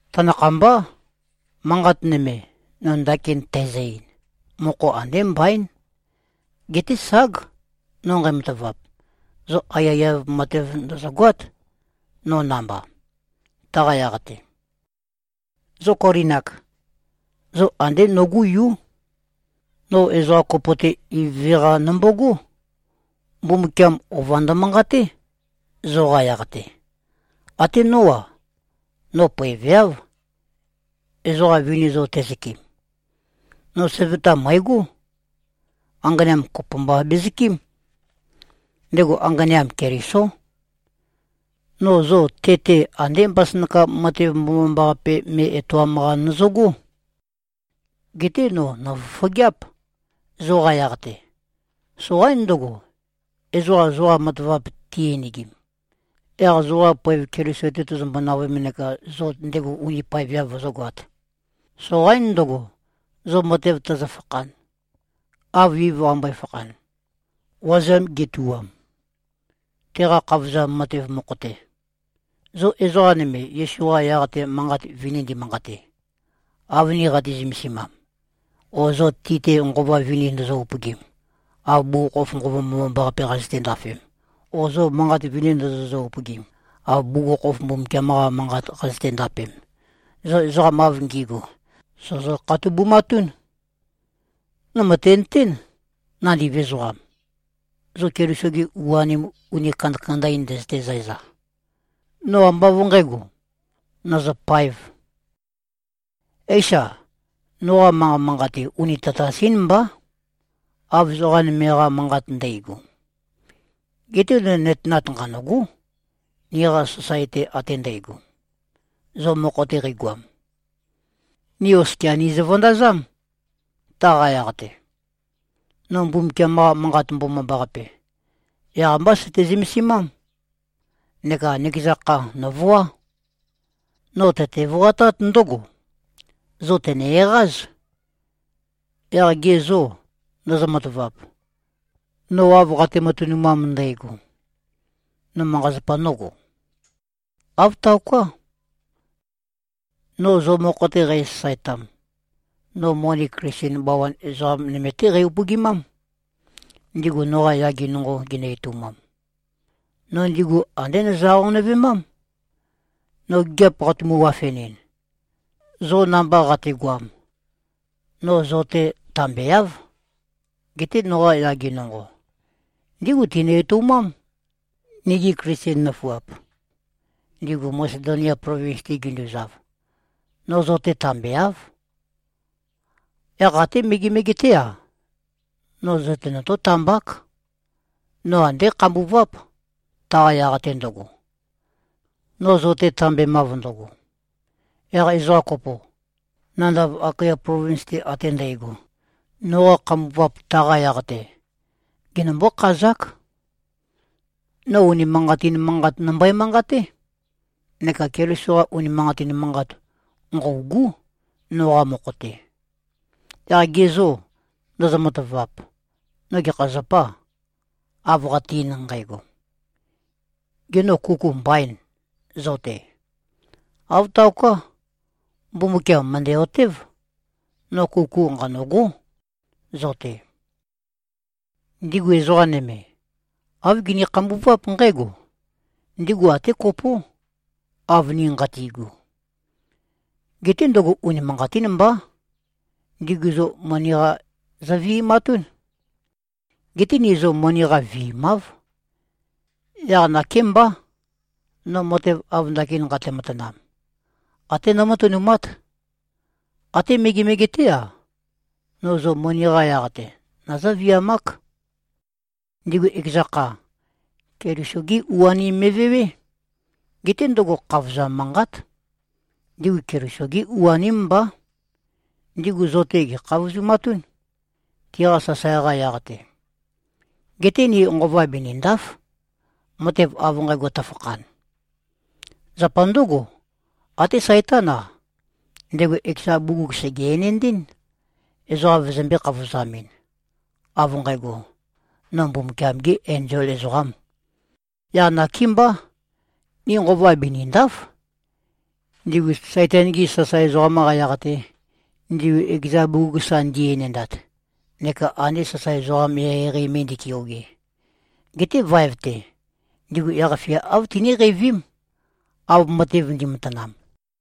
Tanakhambá. Manqat nøme, no ndakin tæzø-ein, mokho andé mbaín. Geté ság, no nqæmatavap, zo aiyaiyav matev ndòzogoát, no namba, taqa yaq-te. Zo Kolin-ak, zo andé nogú yú. No ezoqa kopo-te ivøve-qa nombogó. Mbumbukiam ova ndømanqaté, zoqa yaq-te. Até nó-a, no poeveáv, ezoqa vini zo tezøkɨm. No søvøta mø̀egó. Anganeam kopo mba bezøkɨ́m. Ndego anganeam, Kelisó. No zo te-te andé mbasønakam matev mbomambaqape me etoam-qa nøzøgó. Geté no nòfofogeáp, zoqa yaq-te. Soqaín ndøgo, ezoqa zoqa matavap ti-enegim, yaq zoqa poev Keliso-te tøzømbo-navøem neka zo ndego uni paeveav vøzǿgoāt. Soqaín ndøgo, zo matev tøzøfakhan, av Iv qambøe-fakhan, wazeam getuwam, teqa khavozam matev mokho-te. Zo ezoqa nøme Yesu-qa yaq-te manqat vini ndimanqate, av ni qati-zømesimam, o zo ti-te nqova vini ndozo-upøgim, av bugukhokhof Nqova Mbomambaqape qazøte-ndafem, o zo manqat vini ndozozø-upøgim, av bugukhokhof Mbumbukiam-qa Manqat qazøte-ndapem, zo ezoqa av ngi꞉gu, sòzo-khatobumatún. No mø̀tenøtén. Nandiv ezoqam, zo Keliso-gi u-anim uni kandakanda-in ndøzøte-zæza, no ambá av nqǣgo, nø̀zøpāev. Éisa? Noqa manqa manqate uni tatas-ín mbá, av ezoqa nøme-qa manqat ndægo. Geté no nøtenat nqanø̂gó. Niqa sasae-te ate ndægo, zo mokho-te qeigoam, ni oskia nìzø-vøndazám, taqa yaq-te. No Mbumbukiam-qa Manqat Mbomambaqape, yaq-mbá søte-zømesimám. Neka nøkeza kha nòvoá. No tøte-voatát ndǿgo: Zo tø̀ne-eqáz. Yaq ge zô, ndozo-matavap, no av qate-matønumam ndægo, no manqa-zapa nógo? Āv taoká. No zo mokho-te qæsasaetam, no moni Klisten bawan ezoqa nøme-té qæ-upøgimám, ndigu noqa yage nonqo ginø-etoumam. No ndigu andé nøzø-aqonøvemám. No gigiap qatumu-wafenɨn, zo namba qategoam, no zo-te tambeáv. Geté noqa yage nonqo, ndígu tinø-etoumám, nigi Klisten nøfuap, ndigu Masedonia plovins-te ginduzav. No zo-te tambeáv. Yaq até megemege-té-a, no zo-te notó-tambák. No andé khambuváp, taqa yaq-te ndøgo, no zo-te tambemav ndøgo. Yaq ezoqa kopo, nandav Akaya plovins-te ate ndægo, noqa khambuvap taqa yaq-te, genømbǿ-khazák. No unimanqatin manqat nømbøe-manqaté. Neka Keliso-qa unimanqatin manqat, nqø̂ugú, noqa mokho-te. Yaq ge zô, ndozo-matavap? No gekha zapâ, av qate-ein nqægo? Gê, no kuku mbaîn, zo-te? Āv taoká. Mbumbukiam mø̀ndæ-otév. No kuku nqanø̂gó, zo-te. Ndigu ezoqa nøme, āv gini-khambuváp nqǽgo: Ndigu até kopó, av ni nqati꞉gu. Geté ndøgo unimanqatín mbá. Ndigu zo moni-qa zøvi꞉matún. Geté ni zo moni-qa viimáv. Yaq nakémbá, no matev av ndakin nqate-matanam, até nómatønumát. Até megemege-té-a, no zo moni-qa yaq-te, nøzǿ-viamák. Ndigu ekeza kha, Keliso-gí u-anim me꞉vewé. Geté ndøgo khavozam manqát. Ndigu Keliso-gi u-aním mbá. Ndigu zo-te, gè꞉khavozumatún, tiqa sasae-qa yaq-te. Geté ni nqova binìnda᷄f, matev av nqægo tøfakhan. Zapa ndǿgo, até Saitán-a, ndego ekeza bugug sège-enendɨ́n, ezoqa vøzømbē-khavozamɨn, av nqægo, “No Mbumbukiam-gē enzol ezoqām.” Yaq nakémbá. Ni nqova binìnda᷄f, ndigu Saitan-gi sasae ezoqam-qa yaq-te, ndigu ekeza bugug sa ndi-enendat, neka ande sasae ezoqa eqeieqei me ndi꞉keoge. Geté vaev-te, ndigu yaq-fia āv tiníqeivím, av matev ndi꞉matanam.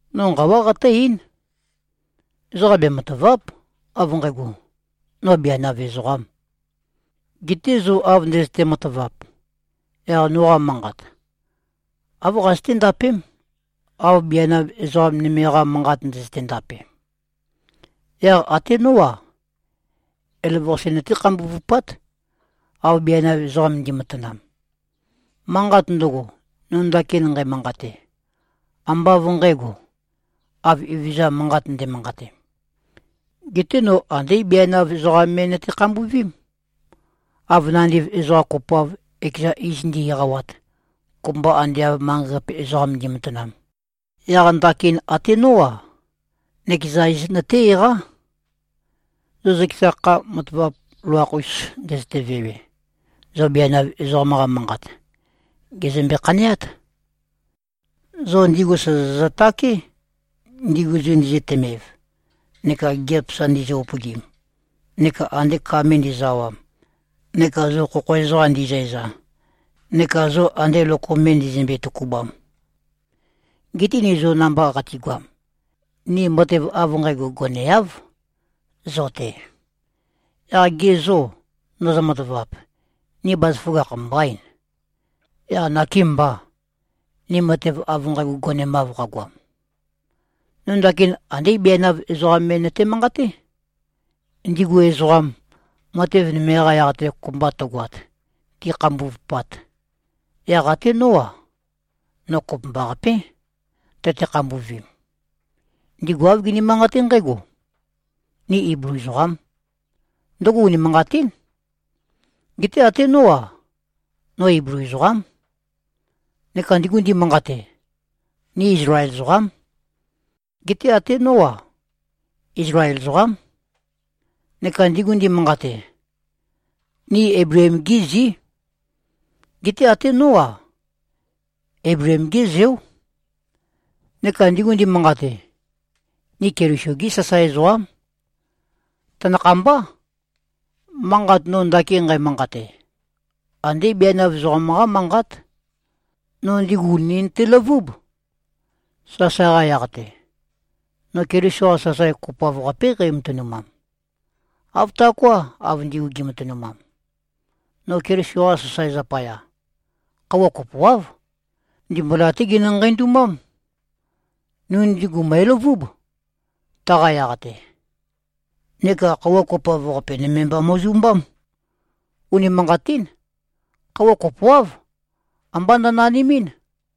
No nqawá qatǿ-eín. Ezoqa bematàva᷄p, av nqægo, no bianav ezoqām. Geté zo av ndøzøte-matavap, yaq noqa manqat, āv qazøté-ndapém, av bianav ezoqa nøme-qa manqat ndøzøte-ndape. Yaq até nó-a, elavøqase nøté-khambuvupát, av bianav ezoqa ndi꞉matanam. Manqat ndøgo, no ndakin nqæmanqate, ambá av ndǣgo, av Evezøza manqat nde꞉manqate. Geté no andé bianav ezoqam me nøte-khambuvím. Av nandiv ezoqa kopoav, ekeza iz ndi꞉-eqawat, kopømba ande av manqei-qape ezoqam ndi꞉matanam, yaq ndakin até nó-a, nøkeza iz nøté-eqá. Zo zøkeza kha matavap loloakh-us ndøzøte-vewe, zo bianav ezoqam-qa manqat, gèzømbe-khaneát. Zo ndigu sòzozø-také, ndigu zo ndizøtømev neka gigiap sa ndizø-upøgim neka ande ka me ndizø-awam neka zo khokho ezoqa ndi꞉zæza neka zo ande lokom me ndizømbe-tøkubam. Geté ni zo namba qatigoam, ni matev av nqægo goneáv, zo-te. Yaq ge zô, ndozo-matavap? Ni bazaføgakh mbaîn, yaq nakêmbà, ni matev av nqægo gonemav qagoam? No ndakin andé bianav ezoqam me nøte-manqaté. Ndigu ezoqam, matev nøme-qa yaq-te kopømba tøgoat, ti꞉khambuvupat, yaq até nó-a, no kopømbaqapé, tøte-khambuvim. Ndigu āv gini-manqate nqǽgo, “Ni Iblu ezoqám.” Ndøgo unimanqatín. Geté até nó-a, no Iblu ezoqám. Neka ndigu ndimanqate, “Ni Izlael ezoqám.” Geté até nó-a, Izlael ezoqám. Neka ndigu ndimanqate, “Ni Eibleem-gí zí.” Geté até nó-a, Eibleem-gé zeó. Neka ndigu ndimanqate, “Ni Keliso-gí sasae ezoqám.” Tanakhambá. Manqat no ndakin nqæmanqate, andé bianav ezoqam-qá manqát. No ndigu ùni nøteløvúb, sasae-qa yaq-te. No Keliso-qa sasae kopoav-qapé qæmatønumam, āv taoká, av ndigu gi꞉matønumam. No Keliso-qa sasae zapaya, khøuwa kopoáv, ndimbula-té ginø-nqeindumám. No ndigu mø̀eløvúb, taqa yaq-te. Neka khøuwa kopoav-qape nøme mba mo꞉zumbám. Unimanqatín. Khøuwa kopoáv, ambá nønanimín.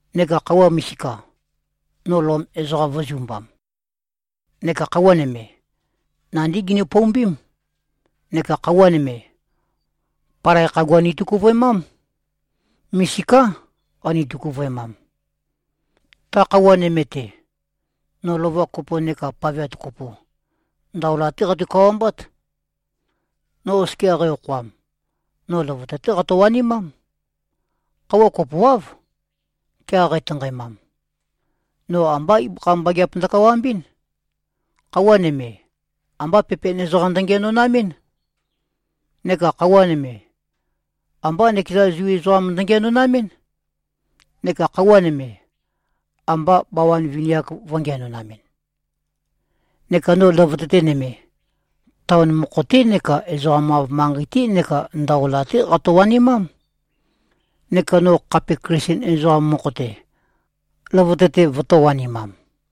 Neka khøuwa misika, no Lom ezoqam vø̄zumbam. Neka khøuwa nøme, nandí gini-poumbím. Neka khøuwa nøme, palai khagua nitøkuvøemám. Misiká, qani-tøkuvøemam. Ta khøuwa nøme-te, no lova kopo nekā paveat kopo, ndaola-té qatu-kawambát. No oskia qæ-okhoam, no løvøte-té qato-wanimám. Khøuwa kopoáv. Kea qætanqaemam, no ambá ibøkha mbageap ndøkawambɨ́n. Khøuwa nøme, ambá pepen ezoqam ndøngiænonamɨ́n. Neka khøuwa nøme, ambá nøkeza Zu ezoqam ndøngiænonamɨ́n, neka khøuwa nøme, ambā bawan vini-ak vø̄ngiænonamɨn. Neka no løvøte-te nøme, taon mokho-té neka ezoqam-av manqei-té neka ndaola-té qatø-wanimám. Neka no khape Klisten ezoqam mokho-te, løvøte-te vøtō-wanimam.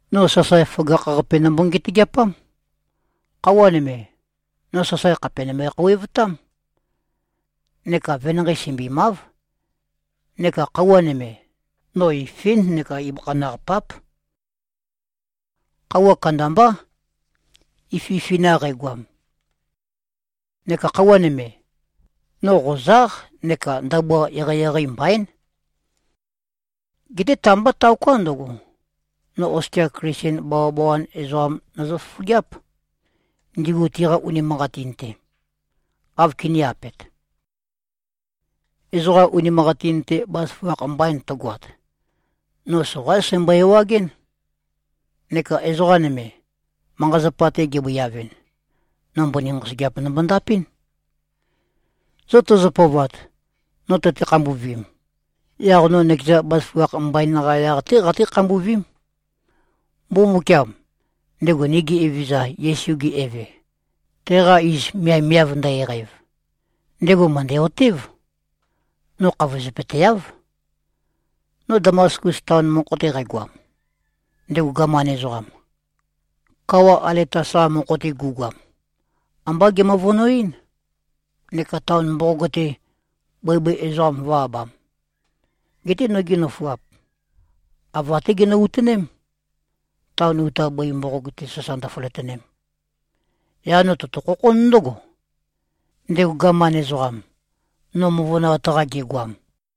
No sasae føgakh-qape nømbo-ngetøgeapám. Khøuwa nøme, no sasae khàpe nømbe-khouwevtám neka venanqei sømbimáv. Neka khøuwa nøme, no ifín neka ibøkha naq páp. Khøuwa kandambá, ififina qægoam. Neka khøuwa nøme, no qozáq neka ndabua eqeieqei mbaín. Geté ta-mbá taoká, ndøgo. No oskia Klisten bawabawan ezoqam nøzø-fofogeáp, ndigu tiqa unimanqatin-te, āv kinī-apet. Ezoqa unimanqatin-te bazaføgakh mbain tøgoat, no soqaín sæmbøe-ewagɨ́n. Neka ezoqa nøme, manqa-zapa-te gebøiavɨn, no mbøni nqosøgeap nombo-ndapɨ́n. Zo tøzø-pøovat, no tøte-khambuvim, yaq no nøkeza bazaføgakh mbain-qa yaq-té qaté-khambuvím. Mbumbukiam, ndego nigi Evezøza Yesu-ge Eve, teqa iz miavmiav ndø-eqæv, ndego mø̀ndæ-otév. No khavozøpøteáv. No Damaskus taon mokho-te qægoam, ndego gaman ezoqam, kawa Aletas-qa mokho-te gu꞉goam, ambá gemøvønoɨ́n, neka taon mboqog-te, bøibøi ezoqam vø̄-abam. Geté nogi nøfuap, ava-té ginø-utoném, taon uta bøi mboqog-te sasa ndøføløtønem. Yaq no tøtø-khokhón ndǿgo, ndego gaman ezoqam, no møvønoat-qa gegoam.